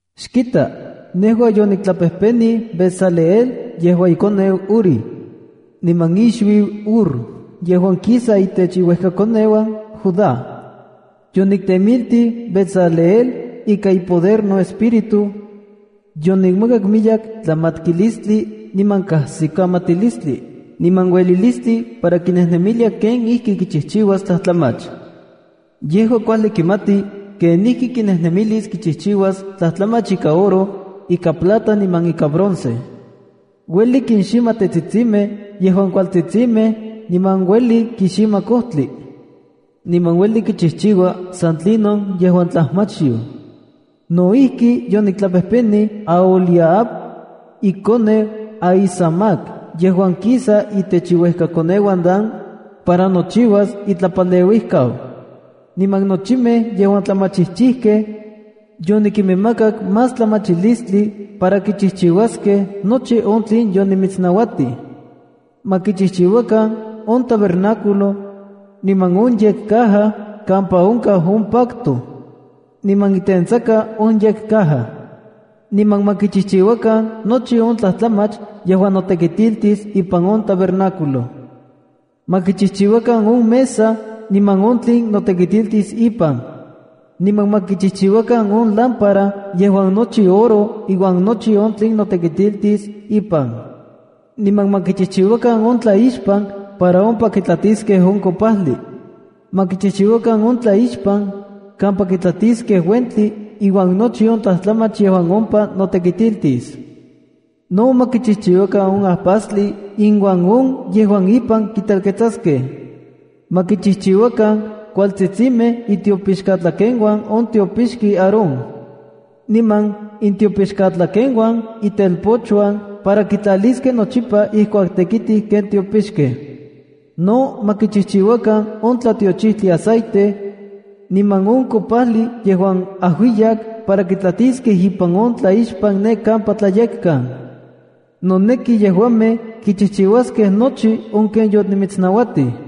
“Xkita, nejua yoniktlapejpenij Bezaleel yejuan ikoneu Uri, niman ixuiu Hur yejuan kisa itech iuejkakoneuan Judá. Yoniktemiltij Bezaleel ika ipoder noEspíritu. Yonikmakak miyek tlamatkilistli niman kajsikamatilistli niman uelilistli para kinejnemilia kenijkikichijchiuas tlajtlamach. Yejua kuajli kimati kenijkikinejnemilis kichijchiuas tlajtlamach ika oro, ika plata niman ika bronce. Ueli kinxima tetsitsimej yejuan kualtsitsimej niman ueli kixima kojtli. Niman ueli kichijchiua san tlinon yejuan tlajmachyoj. No ijki, yoniktlapejpenij Aholiab, ikoneu Ahisamac yejuan kisa itech iuejkakoneuan Dan, para nochiuas itlapaleuijkau. Niman nochimej yejuan tlamachijchijkej, yonikinmakak más tlamachilistli para kichijchiuaskej nochi on tlen yonimitsnauatij. Ma kichijchiuakan on tabernáculo, niman on yekcaja kampa onkaj on pacto, niman itentsaka on yekcaja. Niman ma kichijchiuakan nochi on tlajtlamach yejuan notekitiltis ipan on tabernáculo. Ma kichijchiuakan on mesa niman on tlen notekitiltis ipan. Niman ma kichijchiuakan on lámpara yejuan nochi oro iuan nochi on tlen notekitiltis ipan. Niman ma kichijchiuakan on tlaixpan para ompa kitlatiskej on kopajli. Ma kichijchiuakan on tlaixpan kampa kitlatiskej uentli iuan nochi on tlajtlamach yejuan ompa notekitiltis. No ma kichijchiuakan on ajpastli iuan on yejuan ipan kitelketsaskej. Ma kichijchiuakan kualtsitsimej itiopixkatlakeuan on tiopixki Aarón, niman intiopixkatlakeuan itelpochuan para kitlaliskej nochipa ijkuak tekitij ken tiopixkej. No ma kichijchiuakan on tlatiochijtli aceite, niman on kopajli yejuan ajuiyak para kitlatiskej ipan on tlaixpan ne kampa Tlayekkan. Noneki yejuamej kichijchiuaskej nochi ken yonimitsnauatij.”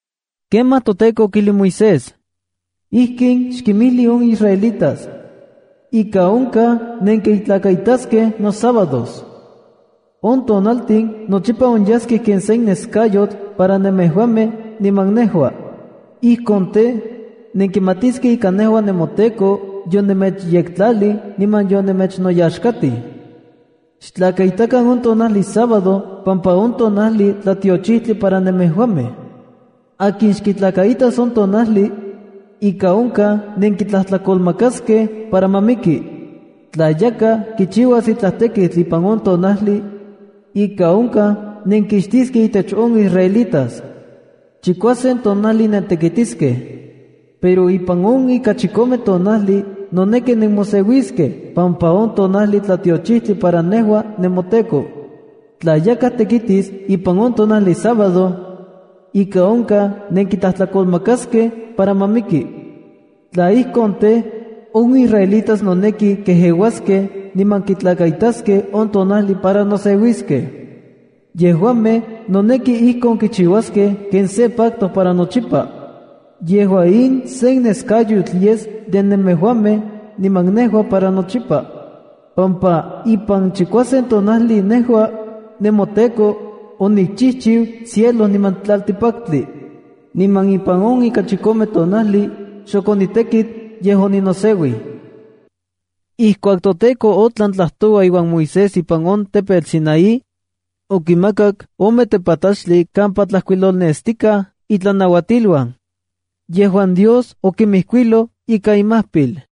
Kemaj toTEKO okijlij Moisés: “Ijkin xkinmijli on israelitas: Ika onkaj nenkitlakaitaskej nosábados. On tonaltin nochipa onyaskej ken sen neskayotl para nemejuamej niman nejua. Ijkon tej, nenkimatiskej ika nejua nemoTEKO yonemechyektlalij niman yonemechnoyaxkatij. Xtlakaitakan on tonajli sábado pampa on tonajli tlatiochijtli para nemejuamej. Akin xkitlakaitas on tonajli, ika onkaj nenkitlajtlakolmakaskej para ma miki. Tla yakaj kichiuas itlaj tekitl ipan on tonajli, ika onkaj nenkixtiskej intech on israelitas. Chikuasen tonajli nentekitiskej, pero ipan on ika chikome tonajli noneki nemoseuiskej pampa on tonajli tlatiochijtli para nejua nemoTEKO. Tla yakaj tekitis ipan on tonajli sábado, ika onkaj nenkitlajtlakolmakaskej para ma miki. Tla ijkon tej, on israelitas noneki kejeuaskej niman kitlakaistaskej on tonajli para noseuiskej. Yejuamej noneki ijkon kichiuaskej ken se pacto para nochipa. Yejua in sen neskayotl yes de nemejuamej niman nejua para nochipa, pampa ipan chikuasen tonajli nejua, nemoTEKO, onikchijchiu cielo niman tlaltikpaktli, niman ipan on ika chikome tonajli, xok onitekit, yej oninoseuij.” Ijkuak toTEKO otlan tlajtoua iuan Moisés ipan on tepetl Sinaí, okimakak ome tepatlachtli kampa tlajkuilolnestikaj itlanauatiluan, yejuan Dios okinmijkuiloj ika imajpil.